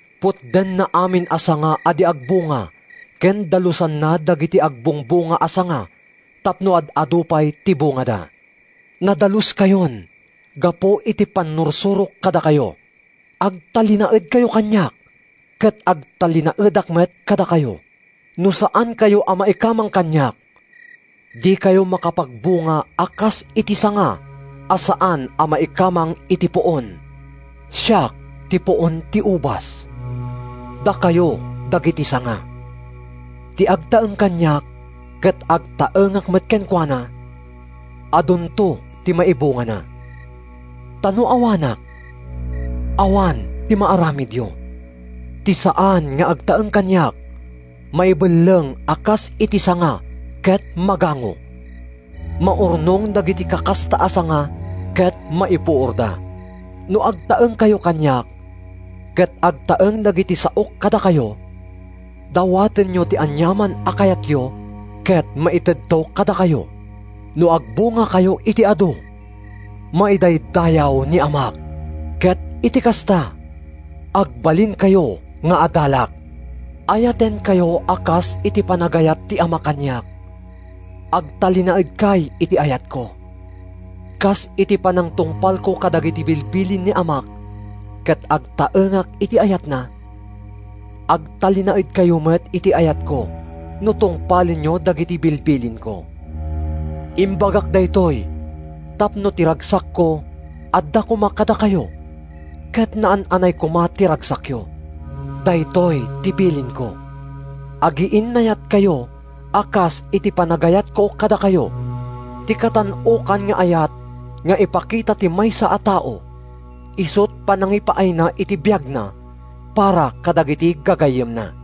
Putdenna amin a sanga a di agbunga ken dalusanna dagiti agbungbunga a sanga tapno ad-adu pay ti bungada. Nadaluskayon gapu iti pannursurok kadakayo. Agtalinaedkayo kaniak ket agtalinaedak met kadakayo. No saankayo a maikamang kaniak, dikayo makapagbunga a kas iti sanga a saan a maikamang iti puon. “Siak ti puon ti ubas, dakayo dagiti sanga. Ti agtaeng kaniak ket agtaengak met kenkuana, adunto ti maibungana. Ta no awanak, awan ti maaramidyo. Ti saan nga agtaeng kaniak, maibelleng a kas iti sanga ket magango. Maurnong dagiti kakasta a sanga ket maipuorda. No agtaengkayo kaniak, ket agtaeng dagiti saok kadakayo, dawatenyo ti aniaman a kayatyo, ket maitedto kadakayo. No agbungakayo iti adu, maidaydayaw ni Amak, ket iti kasta, agbalinkayo nga adalak. Ayatenkayo a kas iti panagayat ti Ama kaniak. Agtalinaedkay iti ayatko. Kas iti panangtungpalko kadagiti bilbilin ni Amak ket agtaengak iti ayatna, agtalinaedkayo met iti ayatko no tungpalenyo dagiti bilbilinko. “Imbagak daytoy tapno ti ragsakko adda koma kadakayo ket naan-anay koma ti ragsakyo. Daytoy ti bilinko: Agiinnayatkayo a kas iti panagayatko kadakayo. Ti katan-okan nga ayat nga ipakita ti maysa a tao isut’ panangipaayna iti biagna para kadagiti gagayyemna.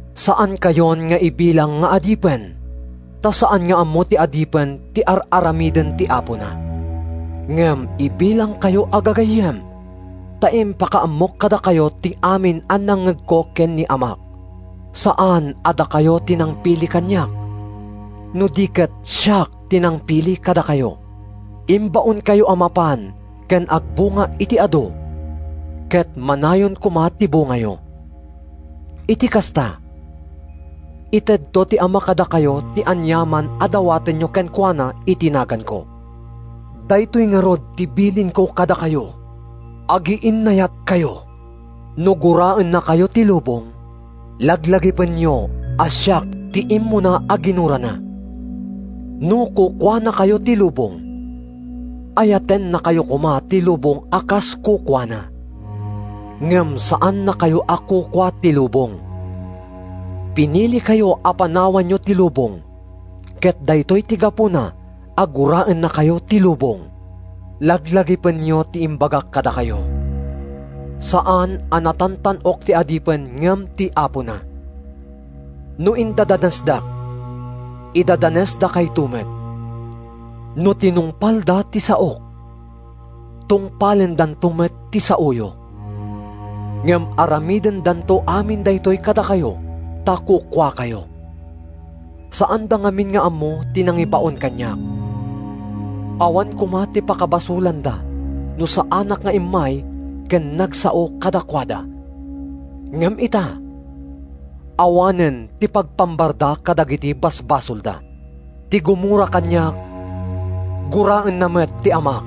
Saankayon nga ibilang nga adipen, ta saan nga ammo ti adipen ti ar-aramiden ti apona. Ngem ibilangkayo a gagayyem ta impakaammok kadakayo ti amin a nangngegko ken ni Amak. Saan a dakayo ti nangpili kaniak, no di ket siak ti nangpili kadakayo. Imbaonkayo a mapan ken agbunga iti adu, ket manayon koma ti bungayo. Iti kasta, itedto ti Ama kadakayo ti aniaman a dawatenyo kenkuana iti naganko. Daytoy ngarud ti bilinko kadakayo: Agiinnayatkayo.” “No guraennakayo ti lubong, laglagipenyo a siak ti immuna a ginurana. No kukuanakayo ti lubong, ayatennakayo koma ti lubong a kas kukuana. Ngem saannakayo a kukua ti lubong. Pinilikayo a panawanyo ti lubong ket daytoy ti gapuna a guraennakayo ti lubong. Laglagipenyo ti imbagak kadakayo: ‘Saan a natantan-ok ti adipen ngem ti apona.’ No indadanesdak, idadanesdakayto met. No tinungpalda ti saok, tungpalendanto met ti saoyo. Ngem aramidendanto amin daytoy kadakayo ta kukuakayo. Saanda ngamin nga ammo ti nangibaon kaniak. Awan koma ti pakabasolanda no saanak nga immay ken nagsao kadakuada. Ngem ita, awanen ti pagpambarda kadagiti basbasolda. Ti gumura kaniak, guraenna met ti Amak.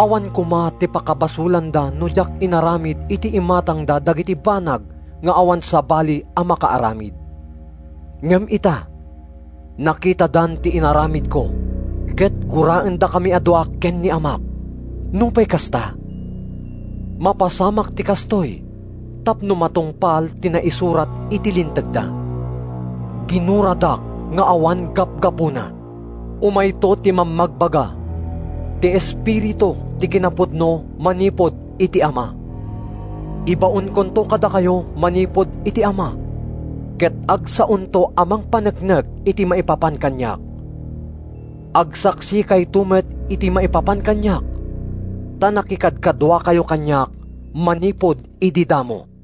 Awan koma ti pakabasolanda no diak inaramid iti imatangda dagiti banag nga awan sabali a makaaramid. Ngem ita, nakitadan ti inaramidko ket guraendakami a dua ken ni Amak. Nupay kasta, mapasamak ti kastoy tapno matungpal ti naisurat iti Lintegda: ‘Ginuradak nga awan gapgapuna.’ “Umayto ti Mammagbaga—ti Espiritu ti kinapudno manipud iti Ama. Ibaonkonto kadakayo manipud iti Ama, ket agsaonto a mangpaneknek iti maipapan kaniak. Agsaksikayto met iti maipapan kaniak, ta nakikadkaduakayo kaniak manipud idi damo.